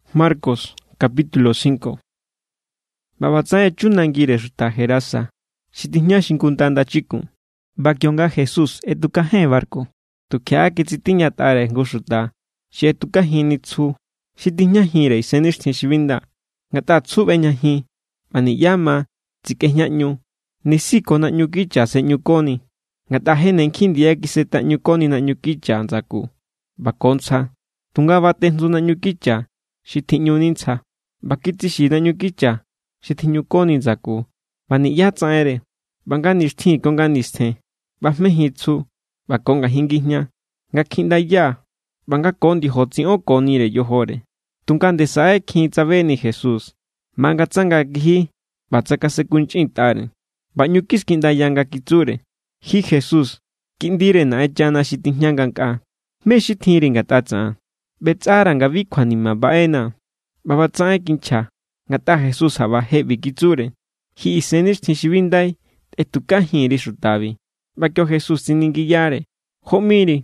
ꞌBa ꞌbatsaꞌen echu nangire xuta Gerasa, xi tijña xingunda ndachikun. ꞌBa kionga Jesús ꞌetjukajen barku, tukjiaꞌa kitsitiñatꞌare jngu xuta xi ꞌetukajinni tsju xi tijñajinre isennixtjin xi bi nda. Ngatꞌa tsju ꞌbejñajin ꞌba niꞌyá ma tsikꞌejñaꞌñu, nisi ko naꞌñu kicha sꞌe̱ꞌñukoni. Ngatꞌa je ne nkjin ndiya kisetaꞌñukoni naꞌñu kicha ndsaku ꞌba ko ntsja, tunga batejntsu naꞌñu kicha xi tjiꞌñuni ntsja, ꞌba kitsixi̱ naꞌñu kicha xi tjiꞌñukoni ndsaku, ꞌba niꞌyá tsaꞌenre. ꞌBa nga nixtjin ko nga nistjen ꞌbajmejin tsju ꞌba ko ngajin ngijña, nga kjiꞌndaya ꞌba nga ko ndiojo tsiꞌonkonire yojore. Tunga nde saꞌe= kjin tsabeni Jesús, mangatsanga kiji ꞌba tsakasenkunchꞌintꞌare, ꞌba ꞌñu kiskiꞌndaya nga kitsure: —Ji Jesús, Kiꞌndire Naꞌenchana xi tijña ngankꞌaa, ¿mé= xi tjinri ngatꞌa tsaꞌan? ꞌBetsꞌara̱ nga bi kjuanima baꞌenaa̱. ꞌBa ꞌba tsaꞌen kinchja ngatꞌa Jesús jaꞌba je ꞌbi kitsure: —¡Ji isennixtjin xi bi ndai, tꞌetukajin_ri xutabi! ꞌBa kio Jesús tsiningiyare: —¿Jó ꞌmiri?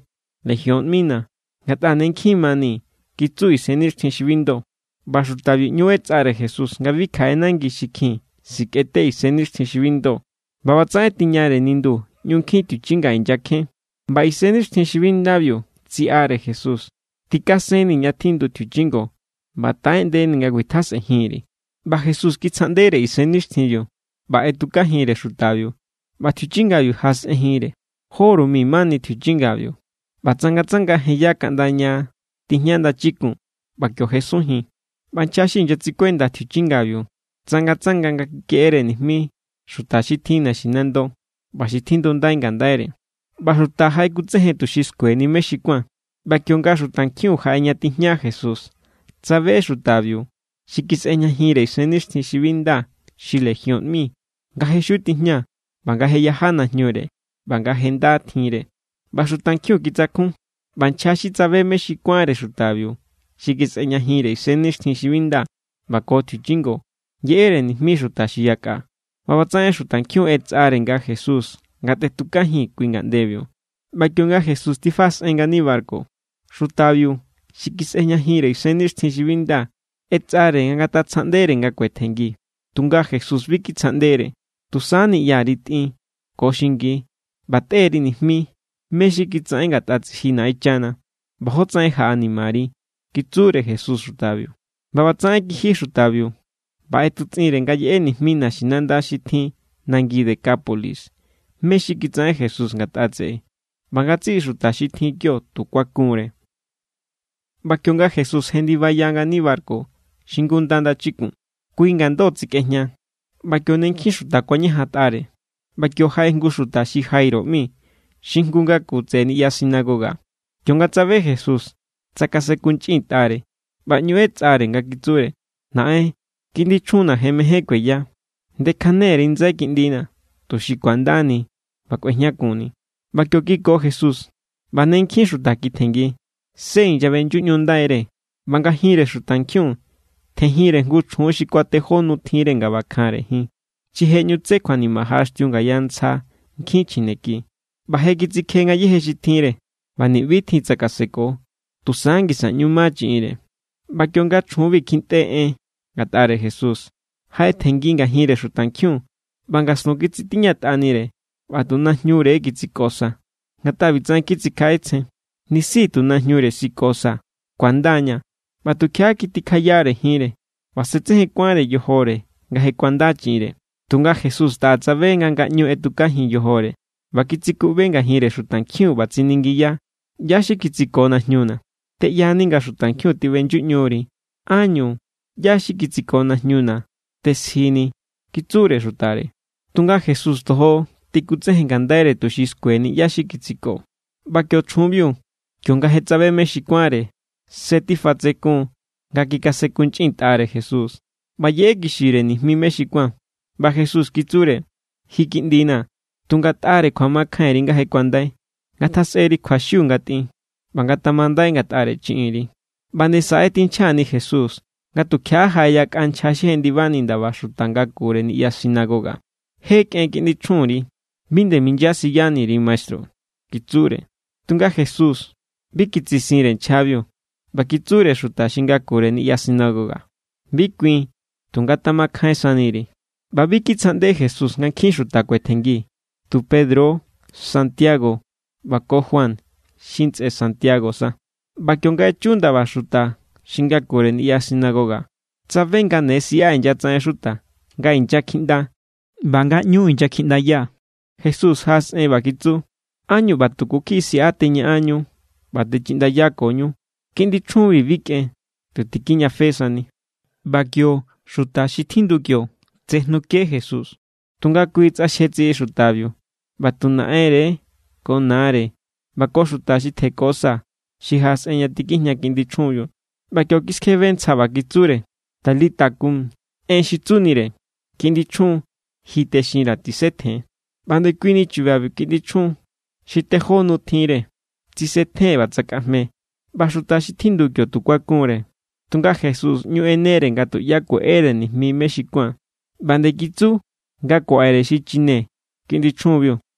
—Legión ꞌmina̱, ngatꞌa ne nkjin mani —kitsu isennixtjin xi bi ndo. ꞌBa xutabiu ꞌñu ꞌetsꞌare Jesús nga bi kjaꞌe nangi xi kjin sikꞌete isennixtjin xi bi ndo. ꞌBa ꞌbatsaꞌen tiñare nindu ꞌñu nkjin tjiuchinga inyakjen, ꞌba isennixtjin xi bi ndabiu tsiꞌare Jesús: —Tikasennii̱ ña tjindu tjiuchinga, ꞌba taꞌeꞌndenii̱ nga kuitjasꞌenjin_ri̱. ꞌBa Jesús kitsjaꞌndere isennixtjinbiu, ꞌba ꞌetukajinre xutabiu ꞌba tjiuchingabiu jaꞌasꞌenjinre. Jóru mi mani tjiuchingabiu, ꞌba tsangatsanga jenya kaꞌnda ña tijña ndachikun, ꞌba kio jesunjin. ꞌBa nchja xi inyatsikuenda tjiuchingabiu tsangatsanga nga kikeꞌere nijmi xuta xi tjin naxinando ꞌba xi tjindundai ngandaire. ꞌBa xuta jaꞌekutsejen tuxi skueni mé= xi kuán. ꞌBa kionga xutankjin jaꞌe ña tijña Jesús, tsabe xutabiu xi kisꞌejñajinre isennixtjin xi bi nda xi Legión ꞌmi, nga je xiu tijña, ꞌba nga je yaja najñure ꞌba nga je nda tjinre; ꞌba xutankjiun kitsakjun. ꞌBa nchja xi tsabe mé= xi kuánre xutabiu xi kisꞌejñajinre isennixtjin xi bi nda ꞌba ko tjiuchingo yeꞌere nijmi xuta xi yakꞌa. ꞌBa ꞌbatsaꞌen xutankjiun ꞌetsꞌare nga Jesús ngatetukajin kui nangibiu. ꞌBa kionga Jesús tifaꞌasꞌen ngani barku, xutabiu xi kisꞌejñajinre isennixtjin xi bi nda ꞌetsꞌare nga ngatatsjaꞌndere nga kuetjenngi. Tunga Jesús bi kitsjaꞌndere. —Tusa niꞌyari tꞌin, ko xingi, ꞌba tꞌe_ri nijmi mé= xi kitsaꞌen ngatꞌa tsiji Naꞌenchana, ꞌba jótsaꞌen jaꞌanimari —kitsure Jesús xutabiu. ꞌBa ꞌbatsaꞌen kiji xutabiu, ꞌba ꞌetutsꞌinre nga yeꞌe nijmi naxinanda xi tjin nangi Decápolis mé= xi kitsaꞌen Jesús ngatꞌa tseꞌe; ꞌba ngatsiꞌi xuta xi tjin kio tu kuakunre. ꞌBa kionga Jesús jendibaya ngani barku xingunda ndachikun, kui ngando tsikꞌejña, ꞌba kio ne nkjin xuta kuañajantꞌare. ꞌBa kio jaꞌe jngu xuta xi Jairo ꞌmi xi jngu ngaku tseꞌe niꞌya sinagoga; kionga tsabe Jesús, tsakasenkunchꞌintꞌare ꞌba ꞌñu ꞌetsꞌare, nga kitsure: —Naꞌen, kiꞌndi chjunna̱ je mején kueya; ndekjane_ri ndsai kiꞌndina̱, tuxi ku̱andani ꞌba kꞌuejñakunni. ꞌBa kio kiko Jesús; ꞌba ne nkjin xuta kitjenngi, se inyaꞌbeꞌnyuꞌñundaire. ꞌBa ngajinre xutankjiun tjenjinre jngu chjun xi kuatejó nu tjinre nga ꞌbakjanre jin. Xi je ne tsé kjuanima jaꞌaxtiu ngaya ntsja nkjin chjineki, ꞌba je kitsikje ngayéje xi tjinre; ꞌba ni̱ꞌbi= tjin tsakaseko, tusa ngisa ꞌñu ma chiꞌinre. ꞌBa kionga chjunbi kjintꞌe en ngatꞌare Jesús, jaꞌetjenngi ngajinre xutankjiun ꞌba ngastun kitsitiñatꞌanire, ꞌba tu najñure kitsiko sa. Ngatꞌa ꞌbitsaꞌen kitsikjaꞌetsjen: “Nisi tu najñure sikosaa̱, ku̱anda=ña̱.” ꞌBa tukjiaꞌa, kitikjayare jinre; ꞌba se tsejen kuánre yojore nga je kuanda chiꞌinre. Tunga Jesús taꞌa tsabe nga ngaꞌñu ꞌetukajin yojore, ꞌba kitsikuꞌbe ngajinre xutankjiun ꞌba tsiningiya: —¿ꞌYá= xi kitsiko najñuna̱? —Teꞌyani nga xutankjiun tiꞌbeꞌyuꞌñuri, ¿ánñu “ꞌYá= xi kitsiko najñuna̱” tesjini? —kitsure xutare. Tunga Jesús tojo tikutsejen ngandaire tuxi skueni ꞌyá= xi kitsiko. ꞌBa kio chjunbiu, kionga je tsabe mé= xi kuánre, se tifatsekun= nga kikasenkunchꞌintꞌare Jesús, ꞌba yeꞌekixire nijmi mé= xi kuán. ꞌBa Jesús kitsure: —Ji, kiꞌndina̱, tu ngatꞌare kjuamakjainri nga je kuandai. Ngatjasꞌeri kjuaxiu nga tꞌin, ꞌba ngatamandai ngatꞌare chiꞌinri. ꞌBa nde saꞌe= tinchjani Jesús, nga tukjiaꞌa jaꞌe yakꞌa nchja xi jendibani ndaba xuta ngakure niꞌya sinagoga. —Je kꞌen kiꞌndi chjunri. Bi nde minyasiyani_ri maestru —kitsure. Tunga Jesús bi kitsisinre nchjabiu, ꞌba kitsure xuta xi ngakure niꞌya sinagoga: —Bi kuin; tu ngatamakjain saniri. ꞌBa bi kitsjaꞌnde Jesús nga nkjin xuta kuetjenngi, tu Pedro=, Santiago, ꞌba ko Juan xi ntsꞌe Santiago sa. ꞌBa kionga echu ndaba xuta xi ngakure niꞌya sinagoga, tsabe nga ne siꞌa inyatsaꞌen xuta nga inyakjiꞌnda ꞌba nga ꞌñu inyakjiꞌndaya. Jesús jaꞌasꞌen ꞌba kitsu: —¿Ánñu ꞌba tuku kjiꞌi siꞌa teñaꞌanñu ꞌba techiꞌndayakoñu? Kiꞌndi chjunbi bi kꞌen, tu tikijñafe sani. ꞌBa kio xuta xi tjindu kio tsejnuke Jesús. Tunga kui tsꞌaxje tsiꞌi xutabiu, ꞌba tu naꞌenre= ko nare ꞌba ko xuta xi tjeko sa xi jaꞌasꞌen ña tikijña kiꞌndi chjunbiu. ꞌBa kio kiskjebe ntsja ꞌba kitsure: —Talita cum. (En xi tsunire: kiꞌndi chjun, ji texinra̱, tisetjen.) ꞌBa ndekuini chubabiu kiꞌndi chjun, xi tejó nu tjinre, tsisetjen ꞌba tsakꞌajme. ꞌBa xuta xi tjindu kio tu kuakun=re. Tunga Jesús ꞌñu ꞌenere nga tuꞌyá kueꞌere nijmi mé= xi kuán, ꞌba nde kitsu nga kuaꞌere xi chine kiꞌndi chjunbiu.